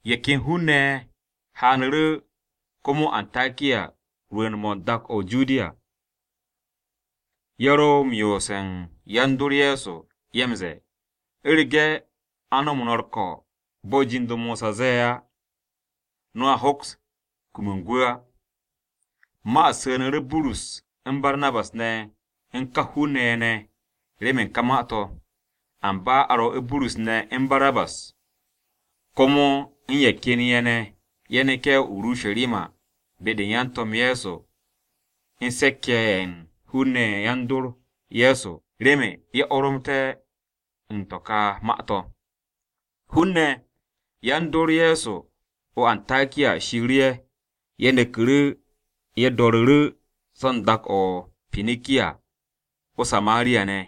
Ye̱ ken hun-ne̱ ye̱ haanu̱ru̱ komo o-Antakiya rwu̱u̱n-mo̱ dak-o̱ o-Judiya. Ye̱ ro m-yoose̱ u̱n yan-dor Ye̱so, ye̱ m-ze̱e̱, “U̱rege̱ a ko̱ no̱ u̱r-ko̱ bo̱ jind-o Mosa ze̱e̱ á, no̱a hoks kum u̱n gwu̱ á.” Ma-u̱t su̱nu̱ru̱ Burus u̱n Barnabas ne̱ u̱n ka hun-ne̱ ye̱ ne̱ remen u̱n ka ma-to̱. Amba a rwo̱'u̱ Burus ne̱ u̱n Barnabas komo u̱n ye̱ ken ye̱ ne̱, ye̱ neke̱ o-Urusharima be-de u̱n yan-To̱m Ye̱so u̱n se̱k-ye̱ ye̱ u̱n hun-ne̱ ne̱ yan-dor Ye̱so remen ye̱ oromté̱ u̱n ka ma-to̱. Hun-ne̱ yan-dor Ye̱so o-Antakiya shiiru̱ ye̱, ye̱ neku̱ru̱ ye̱ do̱ru̱ru̱ so̱ u̱n dak-o̱ o-Pinikiya o-Samariya ne̱,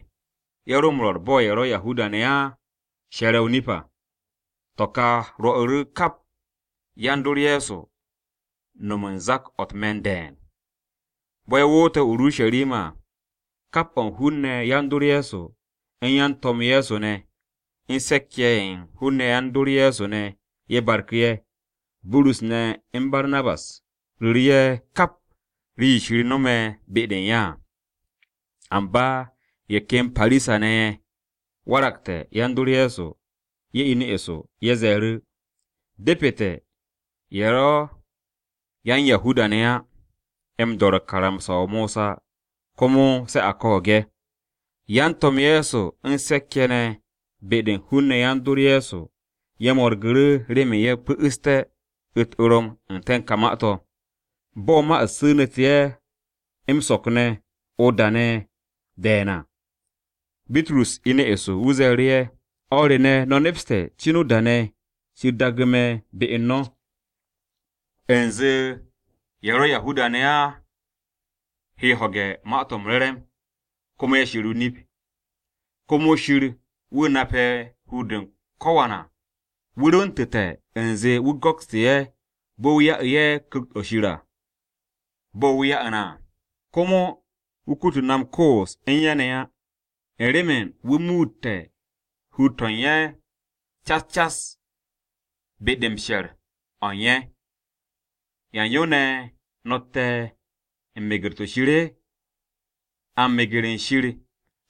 ye̱ ro m-rwo̱r bo̱ ye̱ ro̱ Yahuda-ne̱ á she̱re̱ o-nip à. To̱ ka rwo̱'u̱ kap yan-dor Ye̱so no̱m u̱n zak-o̱ u̱t-me̱n de̱e̱n. Bo̱ ye̱ woote̱ o-Urusharima à, kap o̱ u̱n hun-ne̱ yan-dor Ye̱so, u̱n yan-To̱m Ye̱so ne̱, u̱n se̱k-ye̱ ye̱ u̱n hun-ne̱ yan-dor Ye̱so ne̱, ye̱ barku̱ ye̱. Burus ne̱ u̱n Barnabas ru̱ru̱ ye̱ kap rii-yo Shir no̱me̱ be-de u̱n ye̱ à. Amba ye̱ ken Parisa-ne̱ ye̱ waragte̱ yan-dor Ye̱so, ye̱ inu̱ eso, ye̱ ze̱e̱ru̱, “Depete̱ ye̱ ro̱ yan-Yahuda-ne̱ á m-do̱re̱ karamsa-o Mosa komo se a ko̱o̱g ye̱.” Yan-To̱m Ye̱so u̱n se̱k-ye̱ ne̱ be-de u̱n hun-ne̱ yan-dor Ye̱so ye̱ mo̱rgu̱ru̱ remen ye̱ pu̱'u̱sté̱ u̱t-orom n-te̱ u̱n ka ma-to̱. Bo̱ ma-u̱t su̱nu̱te̱ ye̱ m-so̱k ne̱ o-da ne̱ de̱e̱n à, Bitrus inu̱ eso. Wu̱ ze̱e̱ru̱ ye̱, “O̱r re ne̱, no̱ nepste̱ cin o-da ne̱ Shir daagu̱ me̱ be u̱n no̱, u̱nze ye̱ ro̱ Yahuda-ne̱ á he ho̱ge̱ u̱n Ma-to̱ m-Re̱re̱m, komo ye̱ she̱r o-nip. Shir komo wu̱ nape̱ hur-de u̱n ko̱wan à, wu̱ rwu̱ntu̱te̱ u̱nze wu̱ go̱kstu̱ ye̱ bo̱ wu̱ ya'u̱ ye̱ Ku̱kt-o̱ Shir à, bo̱ wu̱ ya'u̱ na à. Komo wu̱ kutu̱ na m-koos u̱n ye̱ ne̱ á, u̱n remen wu̱ muute̱ hur-to̱ u̱n ye̱ cas cas be-de m-she̱r o̱ u̱n ye̱. ¿Yan yo ne̱ no̱tte̱ u̱n meger-to̱ Shir? A m-meger u̱n Shir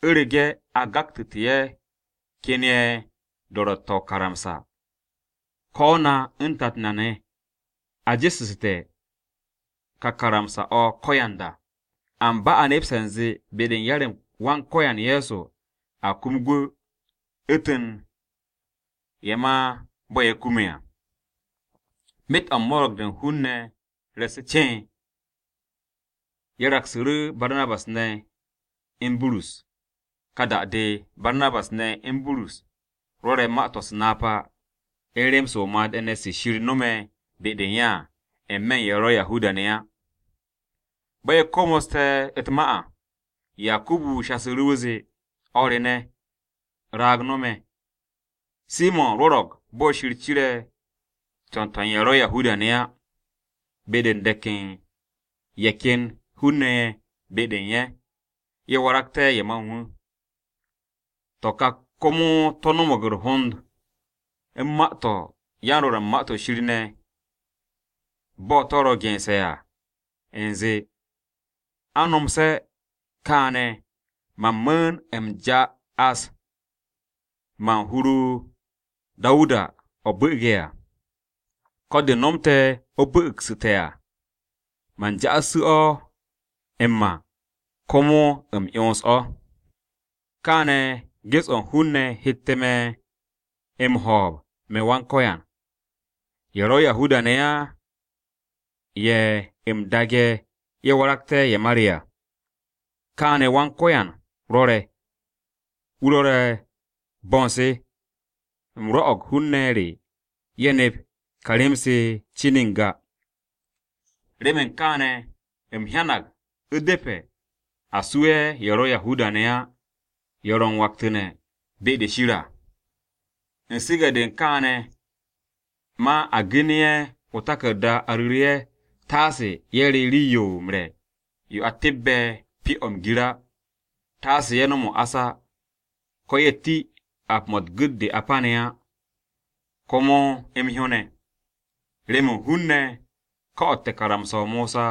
u̱rege̱ a gaktu̱te̱ ye̱ ken ye̱ do̱ro̱tte̱-o̱ o-karamsa. Ko̱ na u̱n tat na ne̱, a jesu̱su̱te̱ ka karamsa-o̱ ko̱yanda! Amba a she̱re̱g u̱nze be-de u̱n yar-m Wan-Ko̱yan Ye̱so a kum gwu̱, u̱ntu̱n ye̱ ma bo̱ ye̱ kume̱ à.” Myet o̱ u̱n mo̱ro̱g-de u̱n hun-ne̱ re̱e̱su̱ ceen, ye̱ raksu̱ru̱ Barnabas ne̱ u̱n Burus. Ka da-de, Barnabas ne̱ u̱n Burus rwo̱re̱ ma-to̱ u̱s-napa, u̱n rem-se o-made̱ ne̱ se Shir nome̱ be-de u̱n ye̱ à, n-me̱ u̱n ye̱ ro̱ Yahuda-ne̱ á. Bo̱ ye̱ komoste̱ u̱t-ma à, Yakubu shasu̱ru̱. Wu̱ zee, “O̱r re ne̱, raag no̱ me̱. Simo̱n rwo̱ro̱g bo̱ Shir cire̱ co̱n-to̱ u̱n ye̱ ro̱ Yahuda-ne̱ á, be-de u̱n de̱k u̱n ye̱ ken hun-ne̱ ye̱ be-de u̱n ye̱, ye̱ waragté̱ ye̱ ma u̱n wu̱. To̱ ka komo to̱ no̱mo̱g u̱r-hond u̱n ma-to̱ yan-Rwo̱r u̱n Ma-to̱ Shir ne̱. Bo̱ to̱ ro gense̱ à u̱nze, “ ‘A nomse̱ kaane̱ man mu̱u̱n u̱m ja'as ma u̱n hur-o Dawuda o̱ bu̱'u̱ge̱ à, Ko̱ de̱ nomte̱ o̱ bu̱'u̱gsu̱te̱ à, man ja'assu̱ o̱ m-ma, komo u̱m 'yons o̱. Kaane̱ ges-o̱ u̱n hun-ne̱ hette̱ me̱ m-ho̱o̱b me̱ Yawe, ye̱ ro̱ Yahuda-ne̱ á ye̱ u̱m daage̱ ye̱ waragté̱ ye̱ ma re à. Kaane̱ Yawe rwo̱re̱, wu̱ rwo̱re̱ bo̱ u̱n se, u̱m rwo̱'o̱g hun-ne̱ re ye̱ nep ka rem-se cin n-ga.’ “Remen kaane̱ u̱m hyanag u̱depe̱ a su'e̱ ye̱ ro̱ Yahuda-ne̱ á ye̱ ro̱ u̱n waktu̱ne̱ be-de Shir à. U̱n su̱ge̱-de u̱n kaane̱ ma a genu̱ ye̱ o-taku̱rda a ru̱ru̱ ye̱ taase ye̱ re̱ rii-yo m-re̱ yo a tebbe̱ pyo-o̱ m-gir á, taase ye̱ nom o-ás, ko̱ ye̱ ti ap-mo̱ u̱n gu̱t-de a pane̱ á, komo m-hyó ne̱. Remen hun-ne̱ ko̱'o̱te̱ karamsa-o Mosa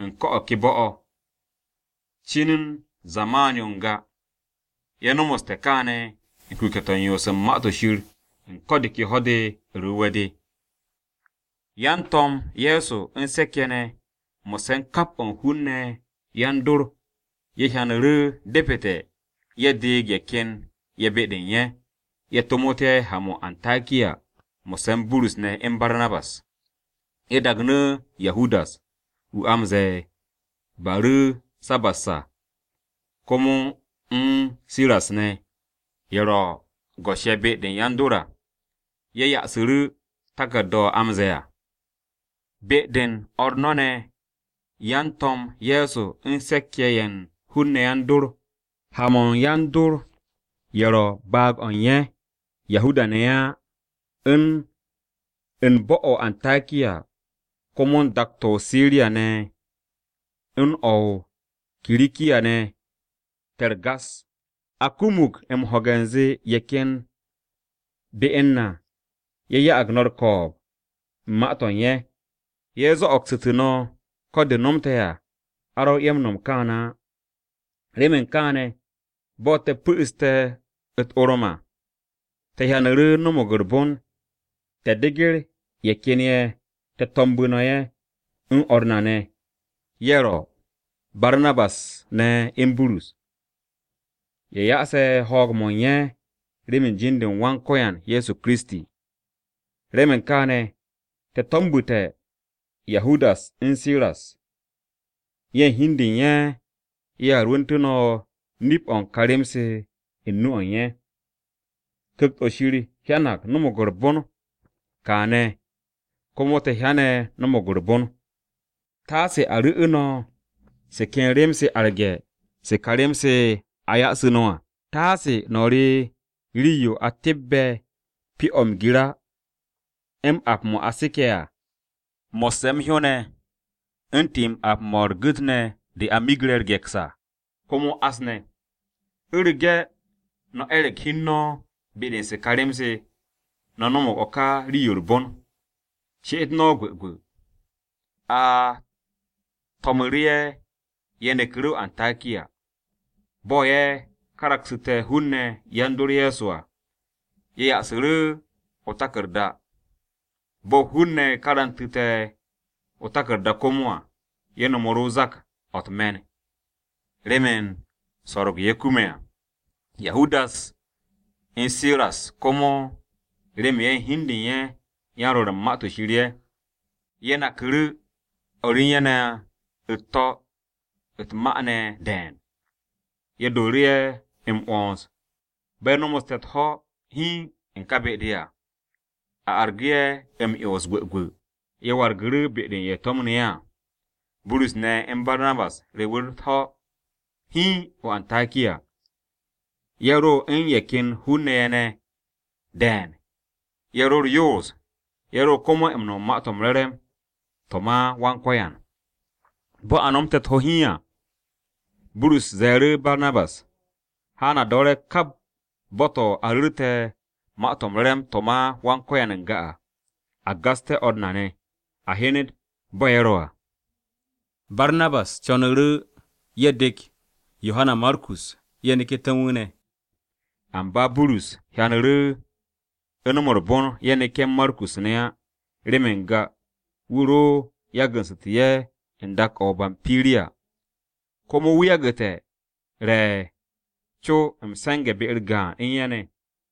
u̱n ko̱ o̱ ke bo̱-o̱. Cin u̱n zaman-yo n-ga, ye̱ no̱mo̱ste̱ kaane̱ u̱n kuke̱-to̱ u̱n yoos u̱n Ma-to̱ Shir u̱n ko̱ de ke Ho̱-de u̱r-Wu̱we̱ de.” Yan-To̱m Ye̱so u̱n se̱k-ye̱ ne̱, mo̱sse̱ u̱n kap o̱ u̱n hun-ne̱ ne̱ yan-dor, ye̱ hyanu̱ru̱ depete̱ ye̱ deeg ye̱ ken ye̱ be-de u̱n ye̱, ye̱ tomot ye̱ ha-mo̱ o-Antakiya mo̱sse̱ u̱n Burus ne̱ u̱n Barnabas. Ye̱ dagnu̱ Yahudas (wu̱ a m-ze̱e̱ Baru̱sabas à), komo u̱n Siras ne̱, ye̱ ro̱ go̱s-ye̱ be-de yan-dor à. Ye̱ ya'asu̱ru̱ taku̱rda-o̱ ro̱ m-ze̱e̱ à: “Be-de u̱n o̱r no̱ ne̱, yan-To̱m Ye̱so u̱n se̱k-ye̱ ne̱ ye̱ u̱n hun-ne̱ yan-dor, ha-mo̱ u̱n yan-dor ye̱ ro̱ baag-o̱ u̱n ye̱, Yahuda-ne̱ ye̱ á, u̱n bo̱-o̱ o-Antakiya, komo u̱n dak-to̱ o-Siriya ne̱ u̱n o̱ o-Kirikiya ne̱, te̱ u̱r-gas. A kumug m-ho̱ge̱ u̱nze ye̱ ken be u̱n na ye̱ ya'ag no̱ u̱r-ko̱o̱b u̱n ma-to̱ u̱n ye̱. Ye̱ zo̱'o̱gsu̱tu̱ no̱, ko̱ de nomte̱ à a rwo̱ ye̱ m-no̱m kaane̱ á. Remen kaane̱, bo̱ te̱ pu̱'u̱ste̱ u̱t-orom à, te̱ hyanu̱ru̱ no̱mo̱g u̱r-bon te̱ deger ye̱ ken ye̱ te̱ to̱mbu̱ no̱ ye̱, u̱n o̱r na ne̱, ye̱ ro̱, Barnabas ne̱ u̱n Burus. Ye̱ ya'ase̱ ho̱o̱g-mo̱ u̱n ye̱ remen jin-u̱r Wan-Ko̱yan na Ye̱so Kiristi. Remen kaane̱, te̱ to̱mbu̱te̱ Yahudas u̱n Siras. Ye̱ u̱n hi u̱n de u̱n ye̱ ye̱a rwu̱ntu̱ no̱ nip-o̱ u̱n ka rem-se u̱n nu-o̱ u̱n ye̱. Ku̱kt-o̱ Shir hyanag no̱mo̱g u̱r-bon, kaane̱ komo te̱ hyane̱ no̱mo̱g u̱r-bon, taase a ru̱'u̱ no̱ se ken nu̱-se arge̱ se̱ ka rem-se se a ya'asu̱ no̱ à. Taase no̱ re rii-yo a tebbe̱ pyo-o̱ m-gir á, m-ap mo̱ a seke̱ à, mo̱sse̱ m-hyó ne̱, u̱n ti-m ap-mo̱ u̱r-gu̱t ne̱ de a miggre̱ u̱r-ge̱ks à, komo o-ás ne̱. U̱rege̱ no̱ e̱re̱g hi u̱n no̱ be-de u̱n se ka rem-se, no̱ no̱mo̱g o̱ ka rii-yo u̱r-bon. She'et no̱ gwu̱gwu̱.” A to̱mu̱ru̱ ye̱, ye̱ neku̱ru̱ o-Antakiya. Bo̱ ye̱ karaksu̱te̱ hun-ne̱ yan-dor Ye̱so à, ye̱ ya'asu̱ru̱ o-taku̱rda. Bo̱ hun-ne̱ karantu̱te̱ o-taku̱rda komo à, ye̱ no̱mu̱ru̱ zak-o̱ u̱t-me̱n u̱n remen so̱ro̱g-yo ye̱ kume̱ à. Yahudas u̱n Siras komo, remen ye̱ hi u̱n de u̱n ye̱ yan-Rwo̱r u̱n Ma-to̱ Shir ye̱, ye̱ naku̱ru̱ o̱r u̱n ye̱ ne̱ u̱t-to̱ u̱t-ma ne̱ de̱e̱n, ye̱ dooru̱ ye̱ m-'wo̱ns. Bo̱ ye̱ nomoste̱ u̱t-ho̱ hiin u̱n ka be-de à, a argu̱ ye̱ m-'yons gwu̱gwu̱, ye̱ wargu̱ru̱ be-de u̱n ye̱ to̱mnu̱ ye̱ à. Burus ne̱ u̱n Barnabas rewu̱ru̱ u̱t-ho̱ hiin o-Antakiya. Ye̱ ro u̱n ye̱ ken hun-ne̱ ye̱ ne̱ de̱e̱n, ye̱ ro u̱r-yoos, ye̱ ro komo u̱n rwo̱r u̱n Ma-to̱ m-Re̱re̱m to̱ ma Wan-Ko̱yan. Bo̱ a nomte̱ u̱t-ho̱ hiin à, Burus ze̱e̱ru̱ Barnabas, “Haan a do̱re̱ kap bo̱-to̱ a ru̱rte̱ Ma-to̱ m-Re̱re̱m to̱ ma Wan-Ko̱yan n-ga à, a gasté̱ o̱r na ne̱, a hyenet bo̱ ye̱ ro̱ à.” Barnabas co̱nu̱ru̱ ye̱ dek Yohana Markus ye̱ neku̱té̱ u̱n wu̱ ne̱. Amba Burus hyanu̱ru̱ u̱ no̱m u̱r-bon ye̱ neke̱ u̱n Markus ne̱ á remen n-ga wu̱ ro yagu̱su̱tu̱ ye̱ u̱n dak-o̱ o-Bampiriya, komo wu̱ yagu̱te̱ re̱ co m-se̱nge̱ be-u̱r gaan u̱n ye̱ ne̱.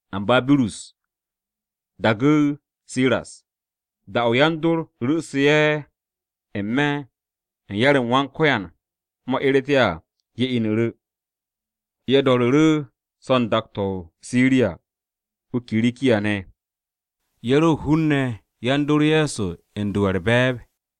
Amba Burus daagu̱ Siras. Da-o̱ yan-dor ru̱'u̱su̱ ye̱ n-me̱ u̱n yar-m Wan-Ko̱yan mo̱ eret ye̱ à, ye̱ inu̱ru̱. Ye̱ do̱ru̱ru̱ so̱ u̱n dak-to̱ o-Siriya o-Kirikiya ne̱, ye̱ ro hun-ne̱ yan-dor Ye̱so u̱n do ye̱ u̱r-be̱e̱b.